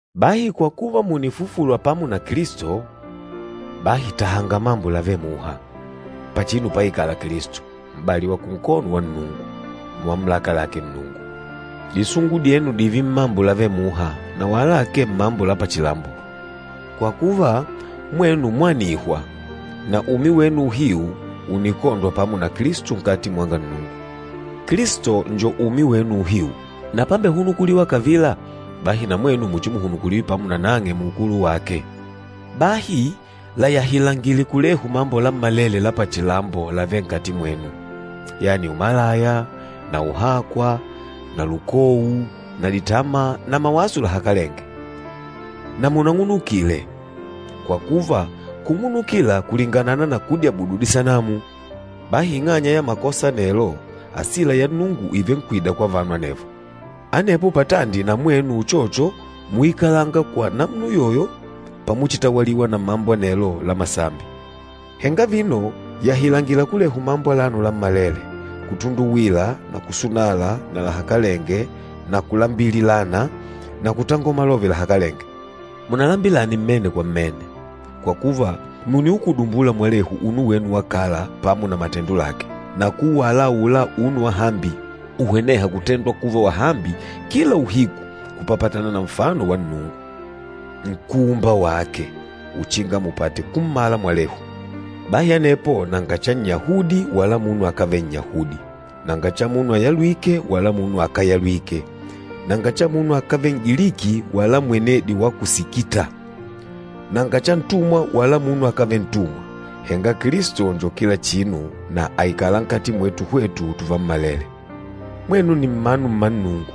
Bahi kwa kuva mùnifufulwa pamo na Kilisto, bahi tahanga mambo lavêle muha, pachinu páikâla Kilisto, m'bali wa kunkono wa Nnungu, mumamulaka lake Nnungu. Disungu dyenu dììve mmambo lavêle muha, na wala akee mmambo la pachilambo. Kwa kuva, mwenu mwanihwa, na umi wenu uhiu ùnikondwa pamo na Kilisto nkati mwanga Nnungu. Kilisto nni umi wenu uhiu, na pámbehunukulîwa kavila, bahi na mwenu muchimuhunukuliwe pamo na nang'e muukulu wake. Bahi layahilangile kulehu mambo lammalele la pachilambo lavêle nkati mwenu, yani umalaya na uhakwa na lukou na ditama na mawaso lahakalenge. Na munang'unukile, kwa kuva kung'unukila kulinganana na kudyabudu disanamu. Bahi ing'anya ya makosa anelo, asila ya Nnungu ìvenkwida kwa vanu anevo. Anepo patandi na mwenu uchocho múikalanga kwa namuna uyoyo pamuchitawaliwa na mambo anelo la masambi. Henga vino yahilangila kulehu mambo alano lammalele, kutunduwila na kusunala na lahakalenge na kulambililana na kutangola malove lahakalenge. Munalambilane mmene kwa mmene, kwa kuva mùniukudumbula mwalehu unu wenu wa kala pamo na matendo lake, na kuuwala aula unu wa hambi uhwenêha kutendwa kuva wahambi kila uhiku kupapatana na nfano wa Nnungu, Nkúumba wake, uchinga mupate kummala mwalehu. Bahi anepo nanga cha Nnyahudi wala munu akávele Nnyahudi, nanga cha munu ayalwîke wala munu akáyalwike, nanga cha munu akávele N'giliki wala mwenedi wa ku Sikita, nanga cha ntumwa wala munu akávele ntumwa. Henga Kilisto njo kila chinu na àikala nkati mwetu hwetu tuvammalele. Mwenu nni mmanu mma Nnungu,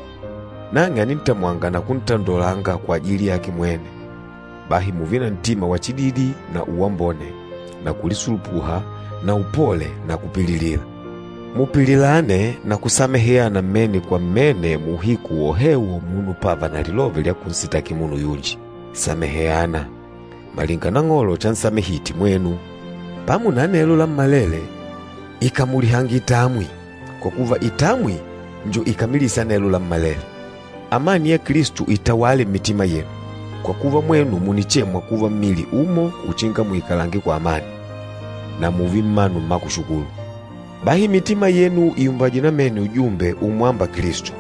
nang'e ànintamwanga na kuntandolanga kwajili yake mwene. Bahi mùùve na ntima wa chididi na uwambone na kulisulupuha na upole na kupililila. Mupililane na kusameheana mmene kwa mmene muuhiku wohewo munu pávà na lilove lya kunsitaki munu yunji. Sameheana, malinga Nang'olo chansamehite mwenu. Pamo na anelo lammalele, ikamulihange itamwi, kwa kuva itamwi njo ikamilîsa anelo lammalele. Amani ya Kilisto itawale mmitima yenu, kwa kuva mwenu mùnichemwa kuva mmili umo uchinga muikalange kwa amani. Na mùùve mmanu mma kushukulu. Bahi mitima yenu ìumbajwe namene ujumbe umwâmba Kilisto,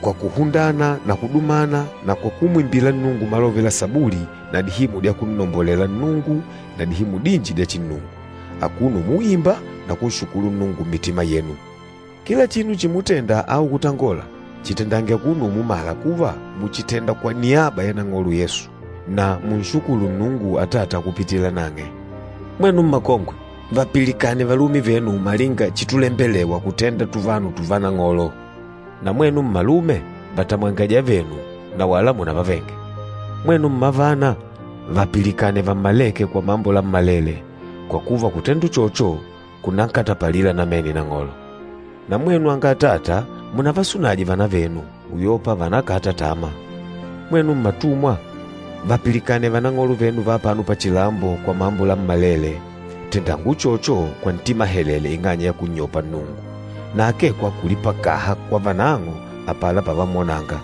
kwa kuhundana na kudumana na kwa kumwimbila Nnungu malove la Sabuli na dihimu dya kunnombolela Nnungu na dihimu dinji dya chinnungu, akuno umuimba na kunshukulu Nnungu mmitima yenu. Kila chinu chimutenda au kutangola, chitendange akuno umumala kuva mùchitenda kwa niaba ya Nang'olo Yesu, na munshukulu Nnungu Atata kupitila nang'e. Mwenu mmakongwe, vapilikane valume venu malinga chitulembelewa kutenda tuvanu tùvá Nang'olo. Na mwenu mmalume, vatamwange ajavenu, na wala munavavenge. Mwenu mmavana, vapilikane vammalêke kwa mambo lammalele, kwa kuva kutenda uchocho kunankatapalila namene Nang'olo. Na mwenu anga atata, munavasunaje vavana venu, uyopa vànakata tama. Mwenu mmatumwa, vapilikane vanang'olo venu va apano pachilambo kwa mambo lammalele. Tendanga uchocho kwa ntima helele ing'anya ya kunnyopa Nnungu, na akee kwa kulipakaha kwa vanang'o apala pavamwonanga.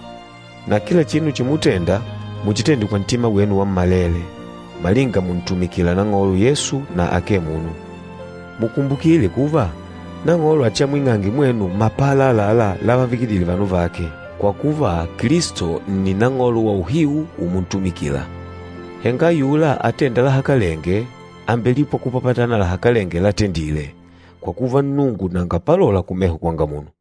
Na kila chinu chimutenda, muchitende kwa ntima wenu wammalele, malinga mùntumikila Nang'olo Yesu na akee munu. Mukumbukile kuva, Nang'olo achiamwing'ange mwenu mapala àlalá lavavikidile vanu vake. Kwa kuva, Kilisto nni Nang'olo wauhiu umuntumikila. Henga ayula atênda lahakalenge, àmbelipwa kupapatana na lahakalenge latendile, kwa kuva Nnungu nanga palola kumeho kwanga munu.